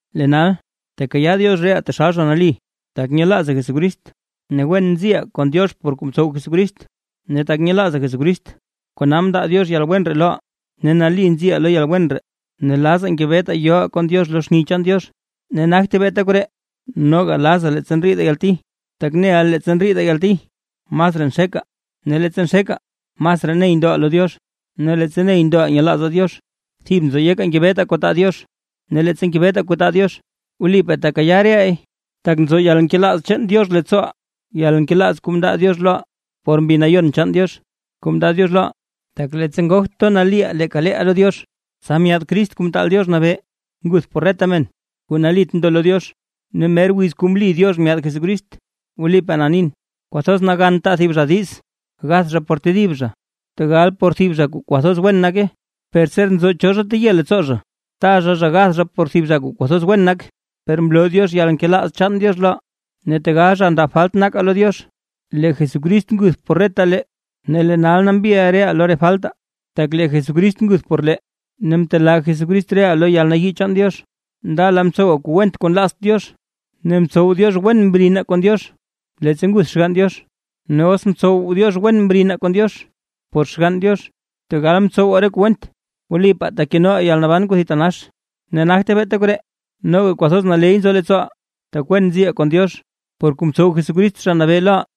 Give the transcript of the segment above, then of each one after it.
Lee nal, tekayaa Diox reʼaa taxal zha nali tak nyelaazaa Jesucrist, ne wen nziʼaa kon Diox por kuu mtsow Jesucrist. Ne tak nyelaazaa Jesucrist kona mndaa Diox yalwen ree loʼaa, ne nali nziʼaa lo yalwen ree, ne lazaa ngebetaa yoʼaa kon Diox lo xni chaan Diox. Ne nagte beeta koree, noga lazaa leettsa ndriidaa yalti; tak neʼaa leettsa ndriidaa yalti masraa nxekaa. Ne leettsa nxekaa masraa ney ndoʼaa lo Diox, ne leettsa ney ndoʼaa nyelaazaa Diox, thib nzo yekaa ngebetaa kuu taa Diox. Ne leettsa ngebetaa kuu taa Diox, wlipaa tekayaa re leey. Tak nzo yalnkelaaz chaan Diox leettsooʼaa; yalnkelaaz kuu mndaa Diox loʼaa por Mbi Nayon chaan Diox kuu mndaa Diox loʼaa. Tak leettsa ngogt gatoʼaa nali leeka leeʼaa lo Diox, tsa myaad Crist Kuu Mtaal Diox Nabee nguth por reta men kuu nalit ndo lo Diox, ne mer wiz kuu mli Diox myaad Jesucrist. Wlipaa na nin, kwathoz nagan taa thib zha diiz gath zha por tedib zha, tegal por thib zha kuu kwathoz wen nake. Per ser nzo cho zha teye leettsoo zha, taa zha zha gath zha por thib zha kuu kwathoz wen nak. Per mloo Diox yalnkelaaz chaan Diox loʼaa, ne tegal zha ndab falt nakaa lo Diox, lee Jesucrist nguth por reta lee. Ne lee nal nambi reʼaa lo re faltaa, tak lee Jesucrist nguth por lee ne mtelaa Jesucrist reʼaa lo yalnayii chaan Diox. Ndala mtsowaa kuu went kuu nlaazt Diox; ne mtsow Diox wen mrinaa kon Diox leettsa nguth Xgann Diox; ne os mtsow Diox wen mrinaa kon Diox por Xgann Diox tegal mtsowaa re kuu went, wlipaa tekenoʼaa yalnaban kuu thitanax. Ne nagte beeta koree, noga kwathoz naley nzo leettsooʼaa, tak wen nziʼaa kon Diox, por kuu mtsow Jesucrist Zha Nabee loʼaa.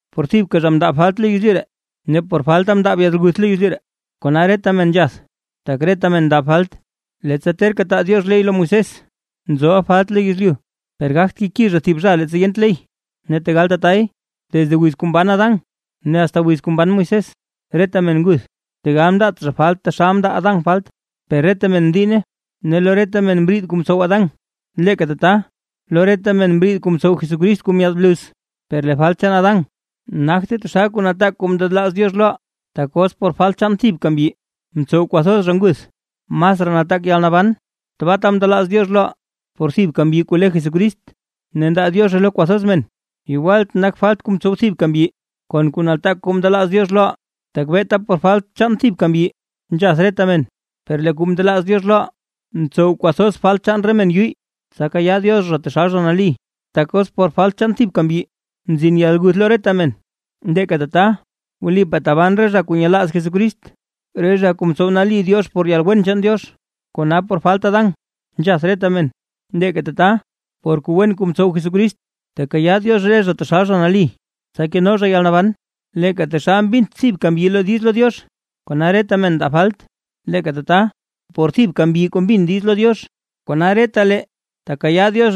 Por thibka zha mndaab falt lo yezlyu ree, ne por falta mndaab yalguth lo yezlyu, kona reta men nzhath, tak reta men ndaa falt. Leettsa terka taa Diox ley lo Moisés, nzoʼa falt lo yezlyu; per gagt keki zha thib zha leettsa yent ley. Ne tegal tatay, desde wiz kuu mban Adán ne asta wiz kuu mban Moisés, reta men nguth, tegal mndaat zha falt taxal mndaa Adán falt, per reta men mdiinne ne lo reta men mriid kuu mtsow Adán, leeka tata lo reta men mriid kuu mtsow Jesucrist kuu myaad bluz. Per lee falt chaan Adán nagte taxal kuu nataak kuu ndelaaz Diox loʼaa. Tak os por falt chaan thibka mbyi mtsow kwathoz zha nguth. Masraa nataak yalnaban kuu tabaata ndelaaz Diox loʼaa, por thibka mbyi kuu le Jesucrist, ne ndaa Diozhe lo kwathoz men. Yegwalt nak falt kuu mtsow thibka mbyi, kon kuu nataak kuu ndelaaz Diox loʼaa, tak beeta por falt chaan thibka mbyi nzhath reta men, per lee kuu ndelaaz Diox loʼaa, ntsow kwathoz falt chaan re men yuyy, tsa kayaa Diox zha taxal zha nali. Tak os por falt chaan thibka mbyi mzin yalguth lo reta men, leeka tata wlipaa taban re zha kuu nyelaaz Jesucrist, re zha kuu mtsow nali Diox por yalwen chaan Diox. Kona por falt Adán nzhath reta men; leeka tata por kuu wen kuu mtsow Jesucrist, tekayaa Diox re zha taxal zha nali, tsa keno zha yalnaban. Leeka taxal mbint thibka mbyi diiz lo Diox, kona reta men ndaa falt, leeka tata por thibka mbyi kuu mbin diiz lo Diox, kona retalee tekayaa Diox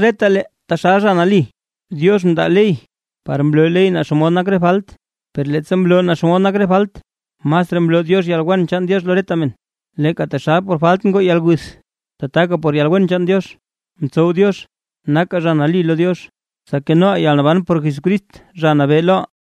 taxal zha nali. Diox mndaa ley par mloo ley naa xomod nak re falt; per leettsa mloo naa xomod nak re falt, masraa mloo Diox yalwen chaan Diox lo reta men. Leeka taxal por falt ngoo yalguth, tataka por yalwen chaan Diox mtsow Diox nakaa zha nali lo Diox, tsa kenoʼaa yalnaban por Jesucrist Zha Nabee loʼaa.